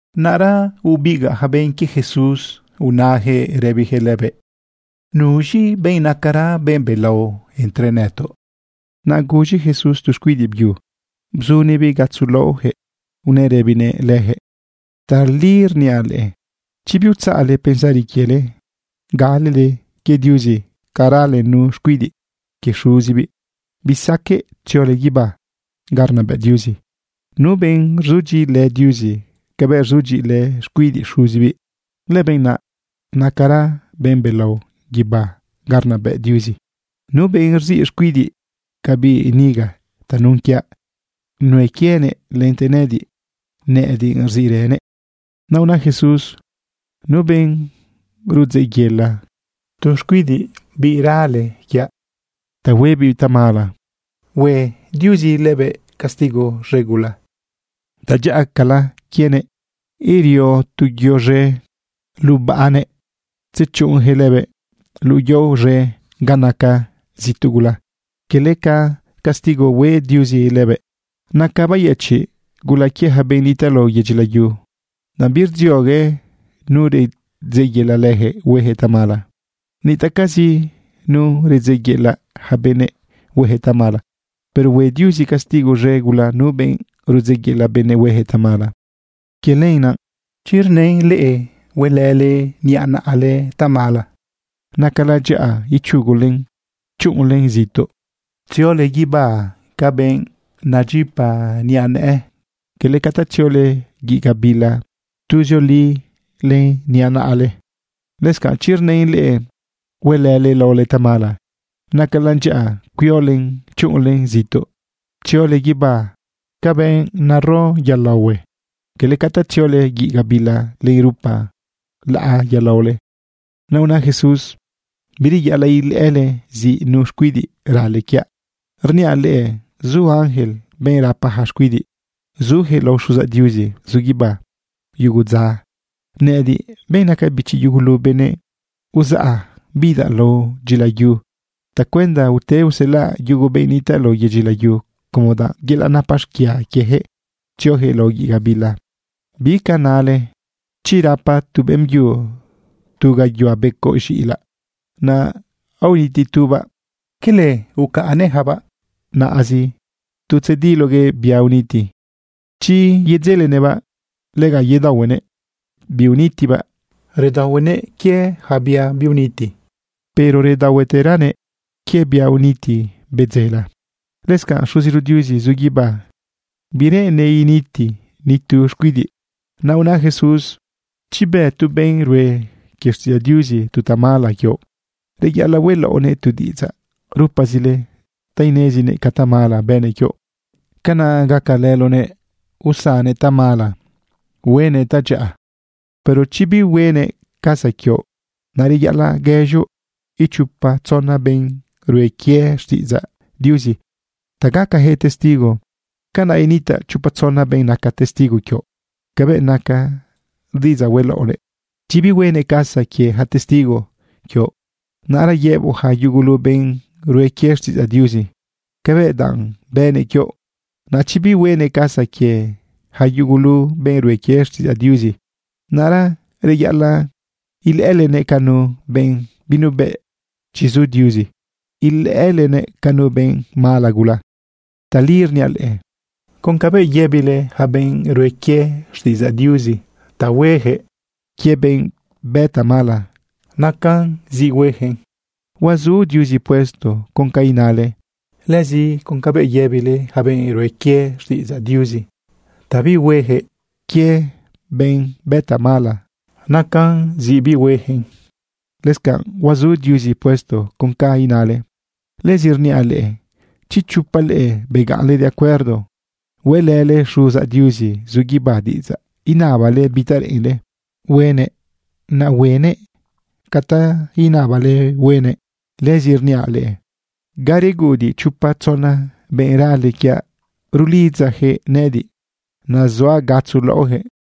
Naꞌra bebigaꞌ yaca benꞌ quie Jesús unajëꞌ rëbijëꞌ lëbëꞌ: ―¿Nuz̃i benꞌ nacara benꞌ belao entre nëtoꞌ? Naꞌ guz̃i Jesús tu xcuidiꞌ byu bzunëꞌbiꞌ gatzo laꞌojëꞌ. Unëꞌ rëbinëꞌ lëjëꞌ: ―Tali rniaꞌ leꞌe, chi biutzaꞌle pensari quiele, galele quie Diuzi ca rale nu xcuidiꞌ quie xuzibiꞌ, bisaqueꞌ tziole guibá ga rnabëꞌ Diuzi. Nu benꞌ rzudyiꞌilë Diuzi cabëꞌ rzudyiꞌilë xcuidiꞌ xuzibiꞌ, lëbenꞌ naꞌ nacara benꞌ belao guibá ga rnabëꞌ Diuzi. Nu benꞌ rziꞌ xcuidiꞌ ca biꞌ niga tanun quiaꞌ, nuen quienëꞌ lente nëꞌëdiꞌ rziꞌrënëꞌ. Naꞌ una Jesús: ―Nu benꞌ rudzeꞌyela tu xcuidiꞌ rale quiaꞌ ta huebiꞌ tamala, hue Diuzi lëbëꞌ castigo z̃e gula. Tadyaꞌacala quienëꞌ erio tu yo z̃e lubaꞌnëꞌ tzechuꞌunjëꞌ lëbëꞌ luꞌu yao z̃e ga naca zituꞌ gula, quele ca castigo hue Diuzi lëbëꞌ. Nacan bayëchiꞌ gula quie ja benꞌ nitaꞌ lao yedyi layu, danꞌ birdziogue nu rudzeꞌyela lëjëꞌ huejëꞌ tamala. Nitaꞌcazi nu rudzeꞌyela ja benëꞌ huejëꞌ tamala, pero hue Diuzi castigo z̃e gula nu benꞌ rudzeꞌyela benëꞌ huejëꞌ tamala. ’Quie lenaꞌ, chi rnën leꞌe huelële niꞌa naꞌale tamala, nacalan dyaꞌa ichugulen chuꞌunlen zituꞌ tziole guibá ca benꞌ nedyipa niꞌa nëꞌë, quele ca ta tziole guiꞌ gabila tuzioli len niꞌa naꞌale. Lëscanꞌ chi rnën leꞌe huelële laole tamala, nacalan dyaꞌa cuiolen chuꞌunlen zituꞌ tziole guibá ca benꞌ nero yolaohue, quele ca ta tziole guiꞌ gabila len rupa laꞌa yolaole. Naꞌ una Jesús: ―Bireyaꞌalaꞌ ilëꞌële ziꞌ nu xcuidiꞌ rale quiaꞌ. Rniaꞌ leꞌe zu ángel, benꞌ rapa ja xcuidiꞌ, zujëꞌ lao Xuzaꞌ Diuzi zu guibá yugu dza. Nëꞌëdiꞌ, benꞌ naca bichi yugulu benëꞌ, uzaꞌa bidaꞌ lao dyilayu tacuenda ute uselaꞌ yugu benꞌ nitaꞌ lao yedyi layu como danꞌ yelaꞌ napa xquia quiejëꞌ tziojëꞌ lao guiꞌ gabila. ’¿Bica nale? Chi rapa tu beꞌmbyu tu gayuhua becoꞌ z̃iꞌilaꞌ, naꞌ aoniti tubaꞌ, ¿quele ucaꞌnnëꞌjabaꞌ naꞌazi tu tzediloguëꞌ bia uniti? Chi yedzelenëꞌbaꞌ, lega yedaohuenëꞌ biunitibaꞌ. Redaohuenëꞌ quie yaca bia biuniti, pero redaohueteranëꞌ quie bia uniti bedzela. Lëscanꞌ Xuziro Diuzi zu guibá, bireꞌennëꞌ initi ni tu xcuidiꞌ. Naꞌ una Jesús: ―Chi bë tu benꞌ rue quie xtiꞌidzaꞌ Diuzi tu tamala quioꞌ, reyaꞌalaꞌ hueꞌlaoꞌnëꞌ tu diꞌidzaꞌ rupazile ta inezinëꞌ ca tamala bënëꞌ quioꞌ. Canaꞌ gacalëloꞌnëꞌ usannëꞌ tamala, huenëꞌ tadyaꞌa. Pero chi bihuenëꞌ casa quioꞌ, naꞌ reyaꞌalaꞌ guëz̃oꞌ ichopa tzona benꞌ rue quie xtiꞌidzaꞌ Diuzi ta gacajëꞌ testigo. Canaꞌ initaꞌ chopa tzona benꞌ naca testigo quioꞌ cabëꞌ naca diꞌidzaꞌ hueꞌlaoꞌnëꞌ. Chi bihuenëꞌ casa quie ja testigo quioꞌ, naꞌra yëboꞌ ja yugulu benꞌ rue quie xtiꞌidzaꞌ Diuzi cabëꞌ danꞌ bënëꞌ quioꞌ. Naꞌ chi bihuenëꞌ casa quie ja yugulu benꞌ rue quie xtiꞌidzaꞌ Diuzi, naꞌra reyaꞌalaꞌ ilëꞌëlenëꞌ ca nu benꞌ binuebëꞌ chi zu Diuzi, ilëꞌëlenëꞌ ca nu benꞌ mala gula. ’Tali rniaꞌ leꞌe, con cabëꞌ yëbile yaca benꞌ rue quie xtiꞌidzaꞌ Diuzi ta hueyaquëꞌ quie benꞌ bë tamala, nacan zi hueyaquëꞌn, huazu Diuzi puesto con ca inale. Lëzi con cabëꞌ yëbile yaca benꞌ rue quie xtiꞌidzaꞌ Diuzi ta bihueyaquëꞌ quie benꞌ bë tamala, nacan zi bihueyaquëꞌn, lëscanꞌ huazu Diuzi puesto con ca inale. ’Lëzi rniaꞌ leꞌe, chi chopa leꞌe begaꞌnle de acuerdo hueꞌlële Xuzaꞌ Diuzi zu guibá diꞌidzaꞌ, inabale bi ta reꞌenle huenëꞌ, naꞌ huenëꞌ ca ta unabale huenëꞌ. Lëzi rniaꞌ leꞌe, ga reguꞌudiꞌ chopa tzona benꞌ rale quiaꞌ, rulidzajëꞌ nëꞌëdiꞌ, nazuaꞌ gatzo laꞌojëꞌ.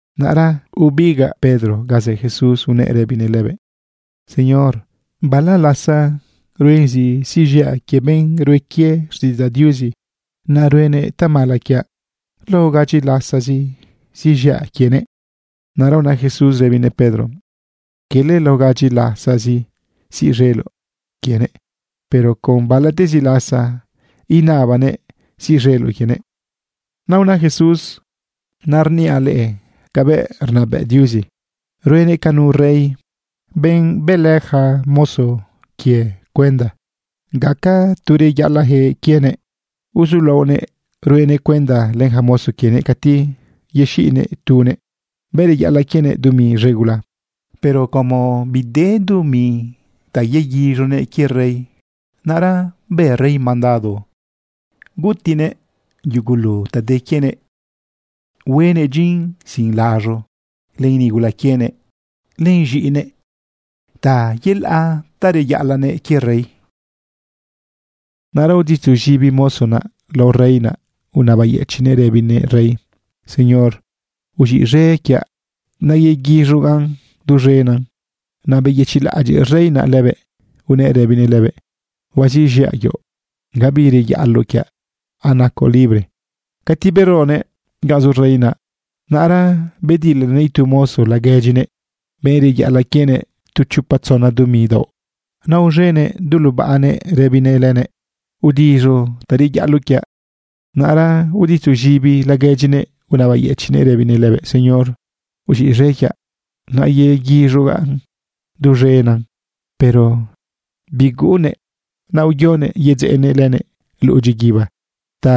Naꞌra bebigaꞌ Pedro ga zë Jesús unëꞌ rëbinëꞌ lëbëꞌ: ―Señor, ¿bala lasa ruen zi siꞌz̃iaꞌ quie benꞌ rue quie xtiꞌidzaꞌ Diuzi ca tamala ruenëꞌ quiaꞌ? ¿Lao gadyi lasazi siꞌz̃iaꞌ quienëꞌ? Naꞌra una Jesús rëbinëꞌ Pedro: ―Quele lao gadyi lasazi siꞌz̃eloꞌ quienëꞌ, pero con balatezi lasa inabanëꞌn siꞌz̃eloꞌ quienëꞌ. Naꞌ una Jesús: ―Naꞌ rniaꞌ leꞌe cabëꞌ rnabëꞌ Diuzi. Ruenëꞌ ca nu rey, benꞌ bëlë ja mozo quienëꞌ cuenda gaca tu reyaꞌalaꞌjëꞌ quienëꞌ. Uzulaonëꞌ ruenëꞌ cuenda len ja mozo quiëꞌ cati yexiꞌnëꞌ tunëꞌ, benꞌ reyaꞌalaꞌ quienëꞌ dumi z̃e gula. Pero como bide dumi ta yeguiz̃uguëꞌ quie rey, naꞌra bë rey mandado gutiꞌnëꞌ yugulu ta de quienëꞌ, huenëꞌ dyin sin laz̃u len nigula quienëꞌ len z̃iꞌinëꞌ ta yelaꞌ ta reyaꞌalaꞌnëꞌ quie rey. Naꞌra uditzuz̃ibi mozo naꞌ lao rey naꞌ, unabayëchiꞌnëꞌ rëbinëꞌ rey: “Señor, uz̃iꞌz̃e quiaꞌ. Nayequiz̃ugaꞌn duz̃enan.” Naꞌ beyëchiꞌlaꞌadyiꞌ rey naꞌ lëbëꞌ, unëꞌ rëbinëꞌ lëbëꞌ: “Huaziꞌz̃iaꞌ quioꞌ, gabi reyaꞌaloꞌ quiaꞌ. Anacoꞌ libre.” Cati beronëꞌ ganꞌ zu rey naꞌ, naꞌra bedilanëꞌ itu mozo laguedyinëꞌ, benꞌ reyaꞌalaꞌ quienëꞌ tu chopa tzona dumi daoꞌ. Naꞌ aoz̃enëꞌ du lubaꞌnëꞌ rëbinëꞌ lënëꞌ: “¡Udiz̃u ta reyaꞌaloꞌ quiaꞌ!” Naꞌra uditzuz̃ibi laguedyinëꞌ unabayëchiꞌnëꞌ rëbinëꞌ lënëꞌ: “Señor, uz̃iꞌz̃e quiaꞌ. Nayequiz̃ugaꞌn duz̃enan.” Pero biguꞌunnëꞌ, naꞌ uyonëꞌ yedzeꞌnëꞌ lënëꞌ luꞌu dyiguiba ta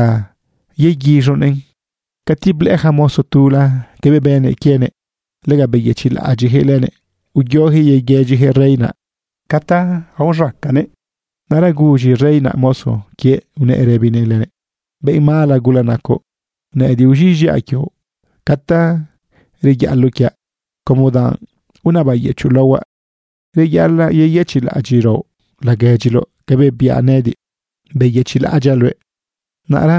yeguiz̃unëꞌn. Cati blëꞌë ja mozo tula cabëꞌ bënëꞌ quienëꞌ, lega beyëchiꞌlaꞌadyiꞌjëꞌ lënëꞌ uyojëꞌ yeguëdyijëꞌ rey naꞌ ca ta uz̃acanëꞌ. Naꞌra guz̃i rey naꞌ mozo quiëꞌ unëꞌ rëbinëꞌ lënëꞌ: “¡Benꞌ mala gula nacoꞌ! Nëꞌëdiꞌ uz̃iꞌz̃iaꞌ quioꞌ ca ta reyaꞌaloꞌ quiaꞌ como danꞌ unabayëchoꞌ laohuaꞌ. Reyaꞌalaꞌ yeyëchiꞌlaꞌadyiꞌraoꞌ laguedyiloꞌ cabëꞌ biaꞌ nëꞌëdiꞌ, beyëchiꞌlaꞌadyaꞌ luëꞌ.” Naꞌra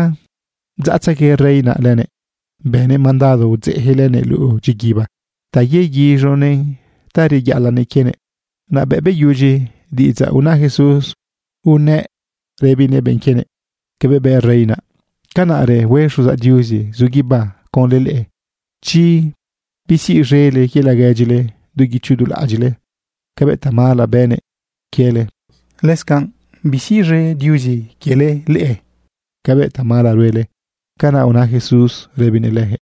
bdzaꞌtzegue rey naꞌ lënëꞌ. Bënëꞌ mandado udzeꞌjëꞌ lënëꞌ luꞌu dyiguiba ta yeguiz̃unëꞌn ta reyaꞌalaꞌnëꞌ quienëꞌ. Naꞌ bëꞌ beyudyi diꞌidzaꞌ una Jesús, unëꞌ rëbinëꞌ benꞌ quienëꞌ: ―Cabëꞌ bë rey naꞌ, canaꞌrë hue Xuzaꞌ Diuzi zu guibá conlë leꞌe, chi bisiꞌz̃ele quie laguedyile du guicho du laꞌadyiꞌle cabëꞌ tamala bënëꞌ quiele, lëscanꞌ bisiꞌz̃e Diuzi leꞌe cabëꞌ tamala ruele. ―Canaꞌ una Jesús rëbinëꞌ lëjëꞌ.